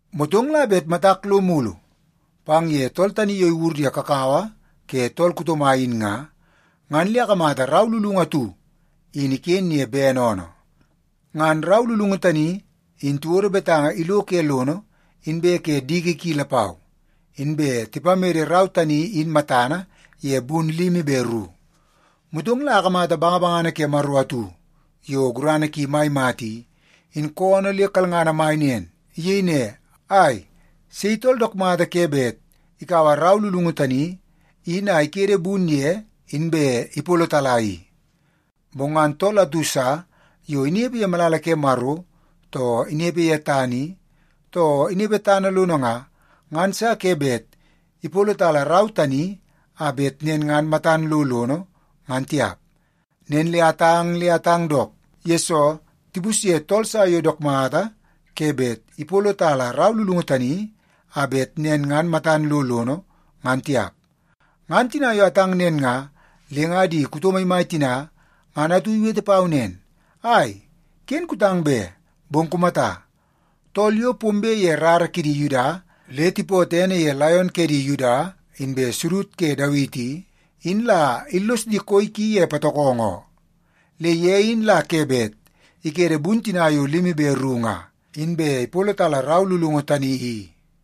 Motong la bet matak lo mulu pang ye tool tani yo iwur ye kakawa ke tool kuto mai in nga, ngan le akamata rau lulungu atu iken ye bene oonoo. Ngan rau lulungu tani in tiwodo betanga ilo ke lono inbe ke diki ki lapau, inbe tipamede rau tani in matana ye bun limi be ru. Motong la akamata bangabangana ke Maro atu yo gurana ki mai mata i, in koonoo le kalngana mai nen. Iyei ne, “Ai, sei tool dook mata ke bet ikaua rau lulungu tani in a ikede bun ye inbe ipolotala i?” Bong ngan tool atu sa yo inepe ye malala ke Maro, too inepe ye tana i, too inepe tana lono nga, ngan sa ke bet ipolotala rau tani a bet nen ngan matan lo lono, ngan tiap. Nen le atang le atang dook, yesoo tipusye tool sa yo dook mata ke bet ipolotala rau lulungu tani a bet nen ngan matan lo lono, ngan tiap. Ngan tina yo atang nen nga, le nga di kuto maimai tina ngan atu iwete pau nen, “Ai, ken kutang be! Bong kumata, tool yo pombe ye rara ke di Yuda le tipootoo ene ye Laion ke di Yuda inbe Sudud ke Dawiti i, in la illos di koi ki ye patokongo oo. Le ye in la ke bet ikede bun tina yo limi be ru nga, inbe ipolotala rau lulungu tani i.”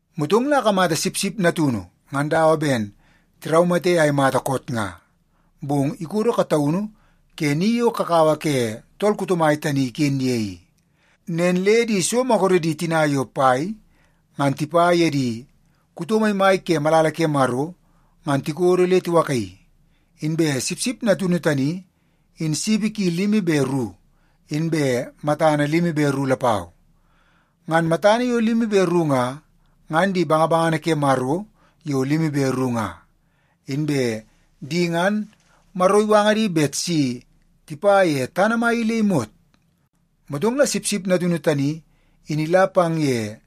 Motong la akamata Sipsip Natunu ngan dawa ben tiraumate a imata koot nga, bong ikodo kataunu ke ni yo kakawa ke tool kuto mai tani iken ye i. Nen le di so maguredi tina yo pai ngan tipa ye di kuto maimai ke malala ke Maro ngan tikodo le tiwakaii. Inbe Sipsip Natunu tani in sipi ki limi be ru inbe matana limi be ru lapau. Ngan matana yo limi be ru nga, ngan di bangabangana ke Maro yo limi be ru nga. Inbe di ngan Maro iwanga di bet si tipa ye tana mai i le imot. Motong la Sipsip Natunu tani in ila pang ye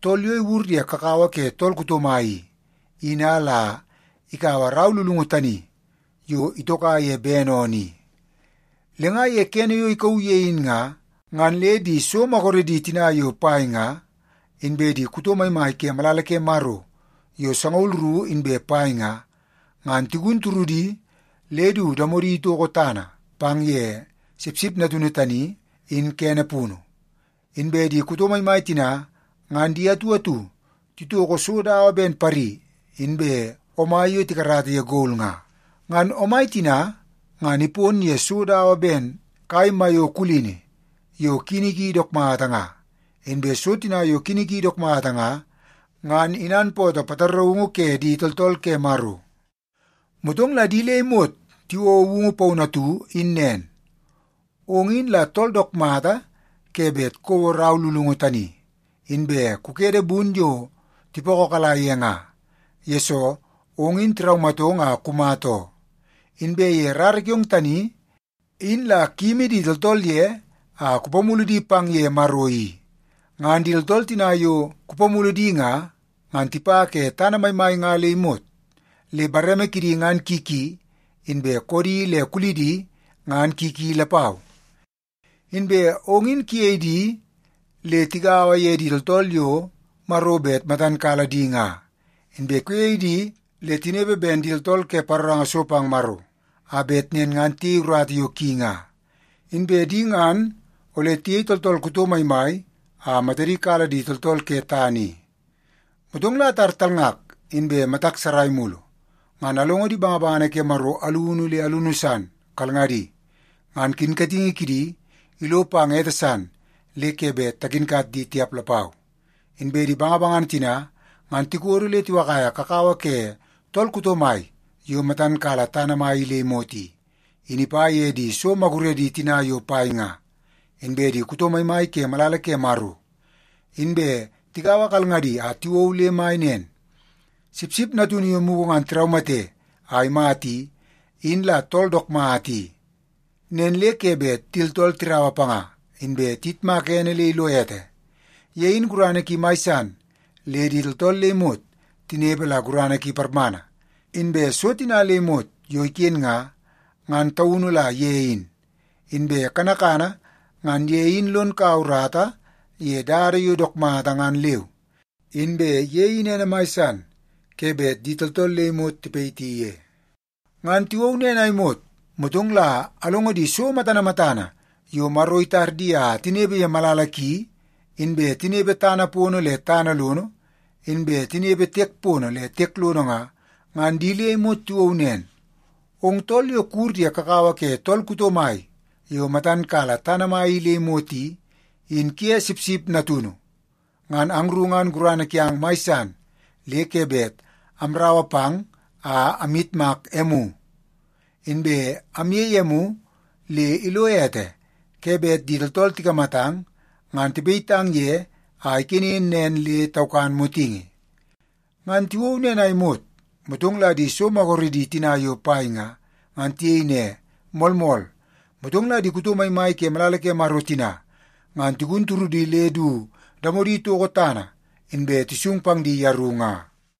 tool yo iwur ye kakawa ke tool kuto mai i, in a la ikaua rau lulungu tani yo itoka ye bene oonoo i. Le nga ye kene yo ikauu ye in nga, ngan le di so maguredi tina yo pai nga, inbe di kuto maimai ke malala ke Maro yo sangaul ru inbe pai nga, ngan tigun turudi le du damodi itoko tana pang ye Sipsip Natunu tani in kene punu. Inbe di kuto maimai tina ngan di atu atu titoko so dawa ben pari inbe omai yo tikarata ye gol nga. Ngan omai tina ngan ipon ye so dawa ben kai maiyo kulini yo kini ki dook mata nga. Inbe so tina yo kini ki dook mata nga, ngan inanpootoo pataraungu ke di tooltool ke Maro. Motong la di le imot tiwouo woungu paunu atu in nen, “Ong in la tool dook mata ke bet kouo rau lulungu tani inbe kukede bun yo tipokokala ye nga, yesoo ong in tiraumatong a kumata oo. Inbe ye rara kiong tani in la kuyimi di tooltool ye a kupamulu di pang ye Maro i. Ngan di tooltool tina yo kupamulu di nga, ngan tipa ke tana maimai nga le imot, le bareme kidi ngan ki ki, inbe koodi le kulidi ngan ki ki lapau. Inbe ong in kuyei di le tigaua ye di tooltool yo Maro bet matan kala di nga, inbe kuyei di le tinepe ben di tooltool ke paroranga so pang Maro a bet nen ngan tiyei urata yo ki nga. Inbe di ngan ole tiyei tooltool kuto maimai a matadi kala di tooltool ke tana i.” Motong la atar talngak inbe matak sarai mulu, ngan alongo di bangabangana ke Maro alunu le alunu san kalngadi. Ngan kinkatingi kidi ilo pang ete san le ke bet takinkat di tiap lapau. Inbe di bangabangana tina ngan tikodo le tiwakaia kakawa ke tool kuto mai yo matan kala tana mai i le imot i, in ipa ye di so maguredi tina yo pai nga, inbe di kuto maimai ke malala ke Maro. Inbe tigaua kalngadi a tiwou le mai nen, “Sipsip Natunu yo mugu ngan tiraumate a imata i, in la tool dook mata i. Nen le ke bet di tooltool tiraua panga, inbe tiyitmaka ene le ilo ete. Ye in gurana ki mai san le di tooltool le imot tinepe la gurana ki parmana. Inbe so tina le imot yo iken nga, ngan taunu la ye in. Inbe kanakana ngan ye in lon kaua urata ye dada yo dook mata ngan leu. Inbe ye in ene mai san ke bet di tooltool le imot tipayiti ye.” Ngan tiwou nen a imot, motong la alongo di so matana matana yo Maro itar di a tinepe ye malala ki, inbe tinepe tana pono le tana lono, inbe tinepe tiek pono le tiek lono nga, ngan di le imot tiwou nen, “Ong tool yo kuwur ye kakawa ke tool kuto mai yo matan kala tana mai i le imot i, in kuye Sipsip Natunu, ngan angru ngan gurana kiang mai san le ke bet amraua pang a amyitmak emu, inbe amyei emu le ilo ete ke bet di tooltool tikamatang ngan tipayitang ye a ikenen nen le taukan motingi!” Ngan tiwou nen a imot, motong la di so maguredi tina yo pai nga, ngan tiyei ne, “Moolmool.” Motong la di kuto maimai ke malala ke Maro tina ngan tigun turudi le du damodi toko tana, inbe tisung pang di yeru nga.